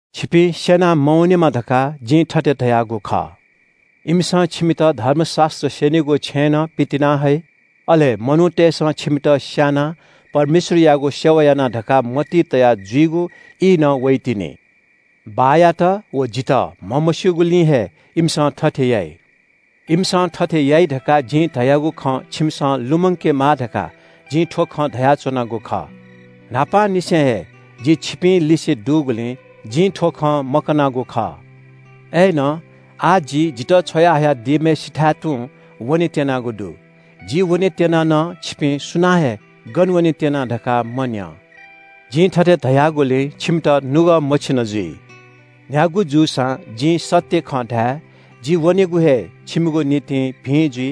“छिपिं स्‍यना मवनेमा धकाः जिं थथे धयागु खः। इमिसं छिमित धर्मशास्‍त्र स्‍यनीगु छेँनं पितिनाहइ। अले मनूतय्‌सं छिमित स्‍यानाः परमेश्‍वरयागु सेवा याना धकाः मतिइ तया जुइगु ई नं वइतिनि। बाःयात व जितः म्‍हमस्‍यूगुलिं हे इमिसं थथे याइ। इमिसं थथे याइ धकाः जिं धयागु खँ छिमिसं लुमंकेमा धकाः जिं थ्‍व खँ धयाच्‍वनागु खः। न्‍हापांनिसें हे जि छिपिंलिसे दुगुलिं जिं थ्‍व खँ मकनागु खः।” “अय्‌नं आः जि जितः छ्वया हयादीम्‍हय्‌सिथाय् तुं वनेत्‍यनागु दु। जि वनेत्‍यना नं छिपिं सुनानं हे ‘गन वनेत्‍यना’ धकाः मन्‍यं। जिं थथे धयागुलिं छिमित नुगः मछिन जुइ। न्‍ह्यागु जूसां जिं सत्‍य खँ धाये, जि वनेगु हे छिमिगु निंतिं भिं जुइ।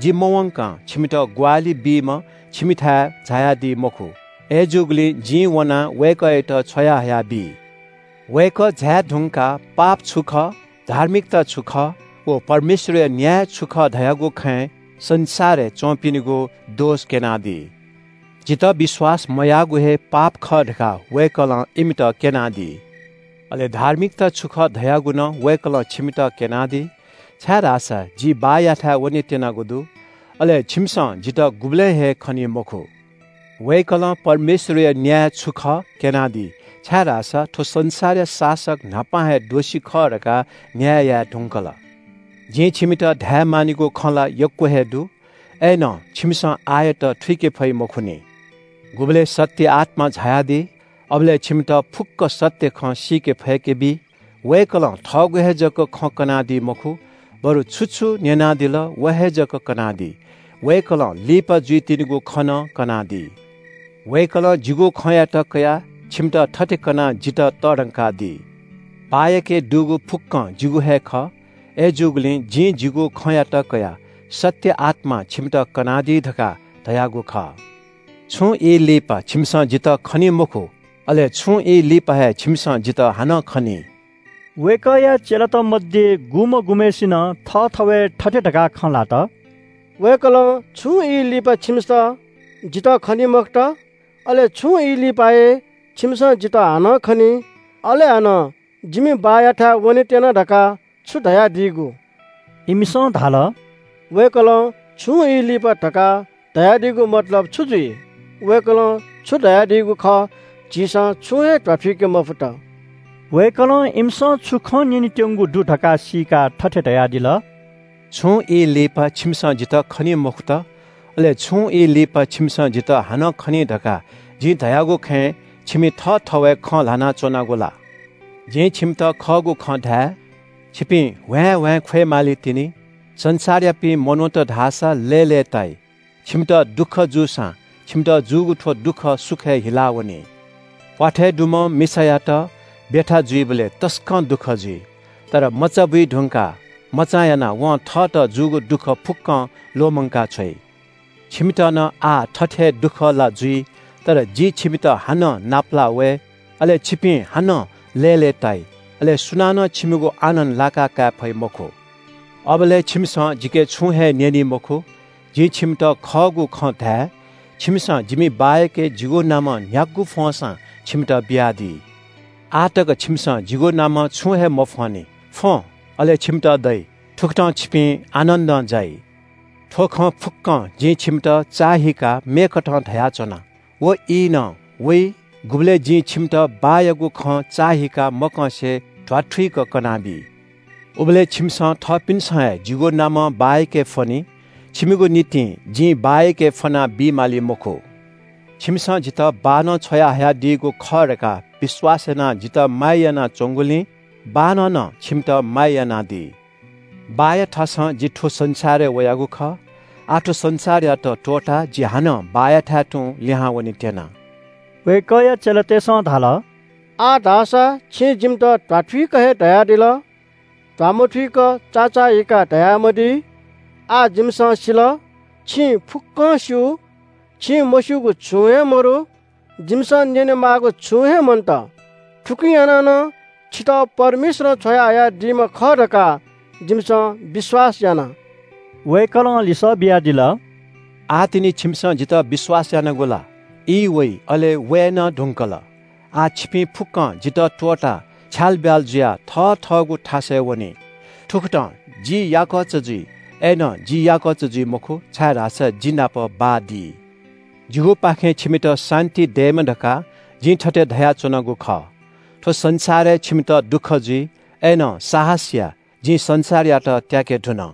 जि मवंकं छिमित ग्‍वाहालि बीम्‍ह छिमिथाय् झायादी मखु। अय्‌जूगुलिं जिं वनाः वय्‌कःयात छ्वयाहया बी। वय्‌कः झाये धुंकाः पाप छु खः, धार्मिकता छु खः व परमेश्‍वरया न्‍याय छु खः धयागु खँय् संसारय् च्‍वंपिनिगु दोष क्‍यनादी। जितः विश्‍वास मयाःगु हे पाप खः धकाः वय्‌कलं इमित क्‍यनादी। अले धार्मिकता छु खः धयागु नं वय्‌कलं छिमित क्‍यनादी, छाय्‌धाःसा जि बाःयाथाय् वनेत्‍यनागु दु। अले छिमिसं जितः गुबलें हे खनी मखु। वय्‌कलं परमेश्‍वरया न्‍याय छु खः क्‍यनादी, छाय्‌धाःसा थ्‍व संसारया शासक न्‍हापा हे दोषी खः धकाः न्‍याय याये धुंकल।” “जिं छिमित धायेमानिगु खँ ला यक्‍व हे दु। अय्‌नं छिमिसं आःयात थुइके फइ मखुनि। गुबलय् सत्‍य आत्‍मा झायादी, अबलय् छिमित फुक्‍क सत्‍य खँ सीके फय्‌के बी। वय्‌कलं थःगु हे जक खँ कनादी मखु, बरु छु छु न्‍यनादिल व हे जक कनादी। वय्‌कलं लिपा जूवइतिनिगु खँ नं कनादी। वय्‌कलं जिगु खँयात कयाः छिमित थथे कनाः जितः तःधंकादी। बाःयाके दुगु फुक्‍कं जिगु हे खः। अय्‌जूगुलिं जिं जिगु खँयात कयाः सत्‍य आत्‍मां छिमित कनादी धकाः धयागु खः।” “छुं ई लिपा छिमिसं जितः खनी मखु, अले छुं ई लिपा हे छिमिसं जितः हानं खनी।” वय्‌कःया चेलात मध्‍ये गुम्‍ह गुम्‍हय्‌सिनं थःथवय् थथे धकाः खँ ल्‍हात – “वय्‌कलं – ‘छुं ई लिपा छिमिसं जितः खनी मखुत,’ अले ‘छुं ई लिपा हे छिमिसं जितः हानं खनी,’ अले हानं – ‘जिमि बाःयाथाय् वनेत्‍यना’ धकाः छु धयादीगु?” इमिसं धाल – “वय्‌कलं – ‘छुं ई लिपा’ धकाः धयादीगु मतलब छु जुइ? वय्‌कलं छु धयादीगु खः झीसं छुं हे ध्‍वाथुइके मफुत।” वय्‌कलं इमिसं छुं खँ न्‍यनेत्‍यंगु दु धकाः सीकाः थथे धयादिल – “छुं ई लिपा छिमिसं जितः खनी मखुत, अले छुं ई लिपा छिमिसं जितः हानं खनी धकाः जिं धयागु खँय् छिमि थःथवय् खँ ल्‍हाना च्‍वनागु ला? जिं छिमित खःगु खँ धाये – छिपिं ह्वाँय्‌ह्वाँय् ख्‍वय् मालीतिनि, संसारयापिं मनूत धाःसा लय्‌लय्‌ताइ। छिमित दुःख जूसां, छिमित जूगु थ्‍व दुःख सुखय् हिलावनी। प्‍वाथय् दुम्‍ह मिसायात ब्‍यथा जुइबलय् तसकं दुःख जुइ, तर मचा बुइधुंकाः मचां यानाः वं थःत जूगु दुःख फुक्‍कं ल्‍वःमंका छ्वइ। छिमित नं आः थथे हे दुःख ला जुइ। तर जि छिमित हानं नापलाः वये, अले छिपिं हानं लय्‌लय्‌ताइ। अले सुनानं छिमिगु आनन्‍द लाकाकाये फइ मखु। अबलय् छिमिसं जिके छुं हे न्‍यनी मखु। जिं छिमित खःगु खँ धाये – छिमिसं जिमि बाःयाके जिगु नामं न्‍ह्यागु फ्‍वंसां छिमित बियादी। आः तक छिमिसं जिगु नामं छुं हे मफ्‍वंनि। फ्‍वँ, अले छिमित दइ, थुकथं छिपिं आनन्‍दं जाइ।” “थ्‍व खँ फुक्‍कं जिं छिमित चाःहिकाः मेकथं धयाच्‍वना। व ई नं वइ गुबलय् जिं छिमित बाःयागु खँ चाःहिकाः मकंसे ध्‍वाथुइक कनाबी। उबलय् छिमिसं थःपिन्‍सं हे जिगु नामं बाःयाके फ्‍वनी। छिमिगु निंतिं जिं बाःयाके फ्‍वना बी माली मखु। छिमिसं जितः बाःनं छ्वयाहयादीगु खः धकाः विश्‍वास यानाः जितः माया यानाच्‍वंगुलिं बाःनं नं छिमित माया यानादी। बाःया थासं जि थ्‍व संसारय् वयागु खः। आः थ्‍व संसारयात त्‍वःताः जि हानं बाःयाथाय् तुं लिहां वनेत्‍यना।” वय्‌कःया चेलातय्‌सं धाल – “आः धाःसा छिं जिमित ध्‍वाथुइक हे धयादिल। ध्‍वामथुइक चाचाःहीकाः धयामदी। आः जिमिसं सिल, छिं फुक्‍कं स्‍यू, छिं मस्‍यूगु छुं हे मदु। जिमिसं न्‍यनेमाःगु छुं हे मन्‍त। थुकिं यानाः नं छितः परमेश्‍वरं छ्वयाहयादीम्‍ह खः धकाः जिमिसं विश्‍वास याना।” वय्‌कलं लिसः बियादिल – “आः तिनि छिमिसं जितः विश्‍वास यानागु ला? ई वइ, अले वये नं धुंकल, आः छिपिं फुक्‍कं जितः त्‍वःताः छ्यालब्‍याल जुयाः थथःगु थासय् वनी। थुकथं जि याकःचा जुइ, अय्‌नं जि याकःचा जुइ मखु, छाय्‌धाःसा जि नाप बाः दी। जिगुपाखें छिमित शान्‍ति दयेमा धकाः जिं थथे धयाच्‍वनागु खः। थ्‍व संसारय् छिमित दुःख जुइ, अय्‌नं साहस या, जिं संसारयात त्‍याके धुन।”